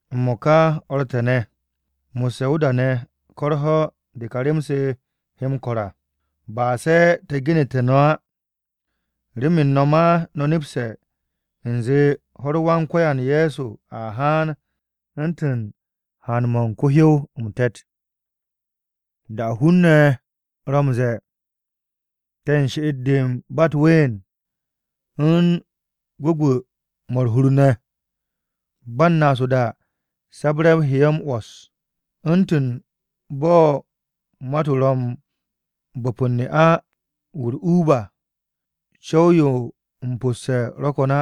M-mo̱ka, o̱r te̱ ne̱, mo̱sse̱ o-da ne̱ ko̱ u̱r-ho̱ de ka rem-se he m-ko̱r à, ba se̱ te̱ genu̱te̱ no̱ á. Remen no̱ ma no̱ nepse̱ u̱nze ho̱-u̱r Wan-Ko̱yan Ye̱so a haan u̱ntu̱n haan-mo̱ u̱n ko-hyow m-te̱t. Da-o̱ hun-ne̱ ro̱ m-ze̱e̱, “Te̱ u̱n she'et-de ba u̱t-ween u̱n gwu̱gwu̱-mo̱ u̱r-hur ne̱,” ba m-naas o-da, sabre̱-o he ye̱ m-'wo̱s, u̱ntu̱n bo̱ mat-o ro̱ m-bo̱p u̱n ne'a-wu̱ u̱r-uub à, co̱w-yo m-po̱sse̱ ro̱ ko̱n á.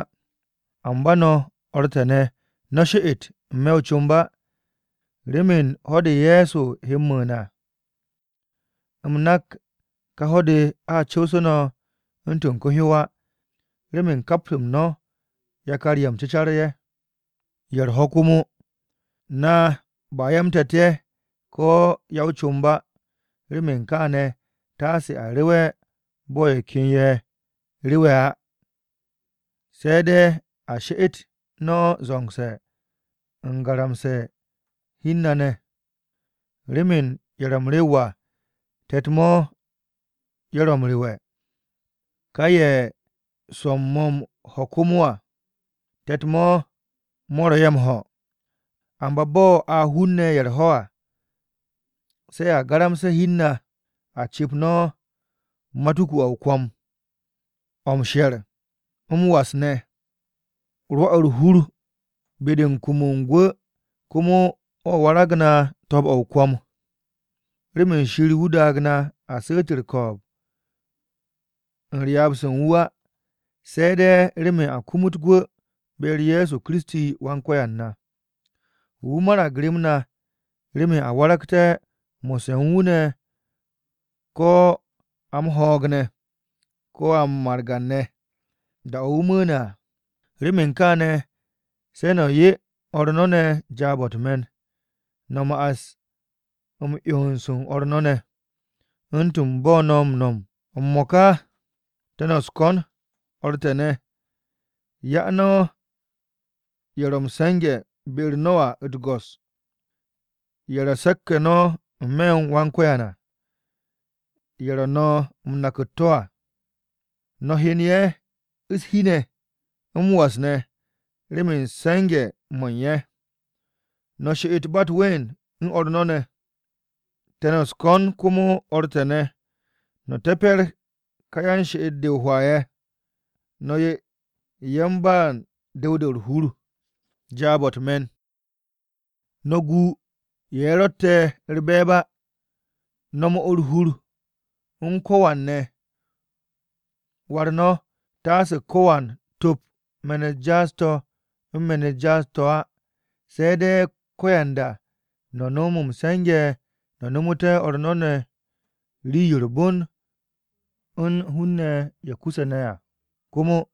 Amba no̱, o̱r te̱ ne̱, no̱ she'et n-me̱ o-comb á. Remen ho̱-de Ye̱so he m-mu̱u̱n à, u̱m nak ka ho̱-de a co̱wse̱ no̱ u̱ntu̱n ko-hyow á. Remen kap-m no̱ yakar-ye̱ m-cu̱car-ye̱, ye̱ u̱r-ho̱ komo. Na ba ya-m-te̱t ye̱, ko̱ ya-o-comb á. Remen kaane̱, taase a rewe̱ bo̱ ye̱ ken ye̱ m-rewe̱ á. Se̱ de̱ a she'et no̱ zo̱ngse̱ u̱n garamse̱ u̱n hi u̱n na ne̱. Remen ye̱ ro̱ m-rew à te̱t-mo̱ ye̱ ro̱ m-rewe̱, ka ye̱ swo̱-m mo̱ m-ho̱ komo à, te̱t-mo̱ mo̱ ro̱ ye̱ m-ho̱. Amba bo̱ a hun-ne̱ ye̱ u̱r-ho̱ à, se̱ a garamse̱ hi u̱n na, a cu̱p no̱ matuku-o̱ o-kwo̱m, o̱ m-she̱r, m-was ne̱. Rwo̱ u̱r-hur be-de u̱n kum u̱n gwu̱ komo o̱ warag na to̱o̱b-o̱ o-kwo̱m. Remen Shir wu̱ daag na a su̱u̱t u̱r-ko̱o̱b u̱n ryaab-se u̱n wu̱ á, se̱ de̱ remen a kumut gwu̱ be-u̱r Ye̱so Kiristi Wan-Ko̱yan na. Wu̱ marag rem na remen a waragté̱ mo̱sse̱ u̱n wu̱ ne̱ ko̱ a m-ho̱o̱g ne̱, ko̱ a margan-ne̱, da-o̱ wu̱ mu̱u̱ne̱ à. Remen kaane̱ se̱ no̱ 'ye o̱r no̱ ne̱ jaab-o̱ u̱t-me̱n. No̱ ma'as m-'yons u̱n o̱r no̱ ne̱, u̱ntu̱n bo̱ no̱ m-no̱m m-mo̱ka à. M-mo̱ka te̱ no̱ u̱s-ko̱n, o̱r te̱ ne̱, 'ya no̱ ye̱ ro̱ m-se̱nge̱ be-u̱r no̱ à u̱t-go̱s, ye̱ ro̱ se̱k-ye̱ no̱ n-me̱ u̱n Wan-Ko̱yan à, ye̱ ro̱ no̱ m-nak u̱t-to̱ à. No̱ hyen ye̱ u̱s-shi ne̱ m-was ne̱ remen se̱nge̱-mo̱ u̱n ye̱. No̱ she'et ba u̱t-ween u̱n o̱r no̱ ne̱. Te̱ no̱ u̱s-ko̱n komo, o̱r te̱ ne̱, no̱ te̱pe̱r ka yan-she'et-de o-hwaa ye̱. No̱ 'ye yan-ba u̱n du̱w-de u̱r-hur jaab-o̱ u̱t-me̱n. No̱ gu ye̱ ro̱tte̱ u̱r-be̱e̱b á. No̱ 'mo u̱r-hur u̱n ko̱wan ne̱. War no̱ taase ko̱wan top me̱n-u̱t jaas-to̱ u̱n me̱n-u̱t jaas-to̱ á, se̱ de̱ ko̱yanda no̱ no̱m m-se̱nge̱ no̱ nomote̱ o̱r no̱ ne̱ rii-yo u̱r-bon u̱n hun-ne̱ ye̱ kuse̱ ne̱ à, komo.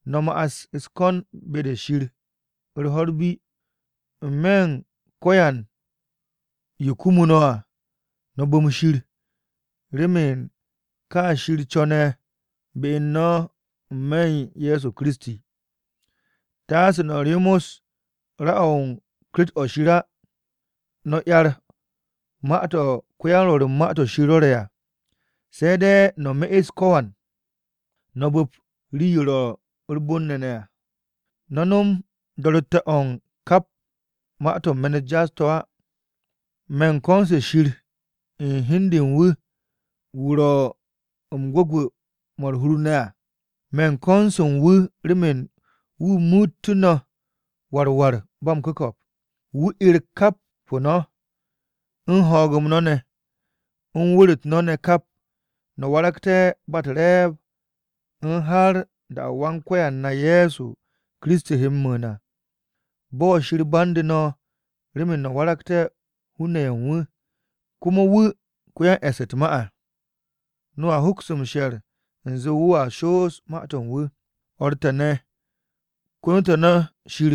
No̱ ma'as u̱s-ko̱n be-de Shir u̱r-ho̱ bi. N-me̱ u̱n ko̱yan yo kumu no̱ à, no̱ bu̱m Shir, remen ka Shir co̱ne̱ be u̱n no̱ n-me̱ u̱n Ye̱so Kiristi. Taase no̱ ryomos ra-o̱ u̱n Ku̱kt-o Shir á. No̱ 'yar ma-to̱ u̱n ko-ya-m-Rwo̱r u̱n Ma-to̱ Shir rwo̱re̱ à. Se̱ de̱ no̱ me'es ko̱yan, no̱ bu̱p rii-yo ro̱ u̱r-bon ne̱ à. No̱ no̱m do̱ro̱tte̱-o̱ u̱n kap ma-to̱ u̱n me̱n-u̱t jaas-to̱ á. Me̱ u̱n ko̱n-se Shir u̱n hi u̱n de u̱n wu̱, wu̱ ro̱ m-gwu̱gwu̱ mo̱ u̱r-hur ne̱ à. Me̱ u̱n ko̱n-se u̱n wu̱ remen wu̱ muutú̱ no̱ war war ba m-ku̱ko̱p, wu̱ 'er ku̱kt-o no̱, u̱n ho̱o̱g-m no̱ ne̱, u̱n wu̱r-u̱t no̱ ne̱ kap, no̱ waragté̱ ba u̱r-re̱e̱b u̱n har da-o̱ Wan-Ko̱yan na Ye̱so Kiristi he m-mu̱u̱n à. Bo̱ Shir bande̱ no̱ remen no̱ waragté̱ hun-ne̱ u̱n wu̱, komo wu̱ ko-yan-e̱ss u̱t-ma à, no̱a hoks m-she̱r u̱nze wu̱a shoos ma-to̱ u̱n wu̱. O̱r te̱ ne̱, kono te̱ no̱ Shir.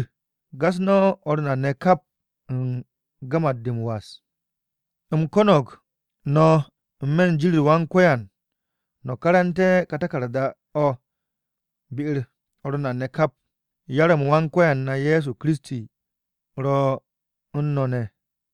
Gas no̱ o̱r na ne̱ kap u̱n gamat-de m-was. U̱m ko̱no̱g no̱ n-me̱ u̱n jin-u̱r Wan-Ko̱yan, no̱ karante̱ ka taku̱rda-o̱ be-u̱r o̱r na ne̱ kap. Yar-m Wan-Ko̱yan na Ye̱so Kiristi ro̱ u̱n no̱ ne̱!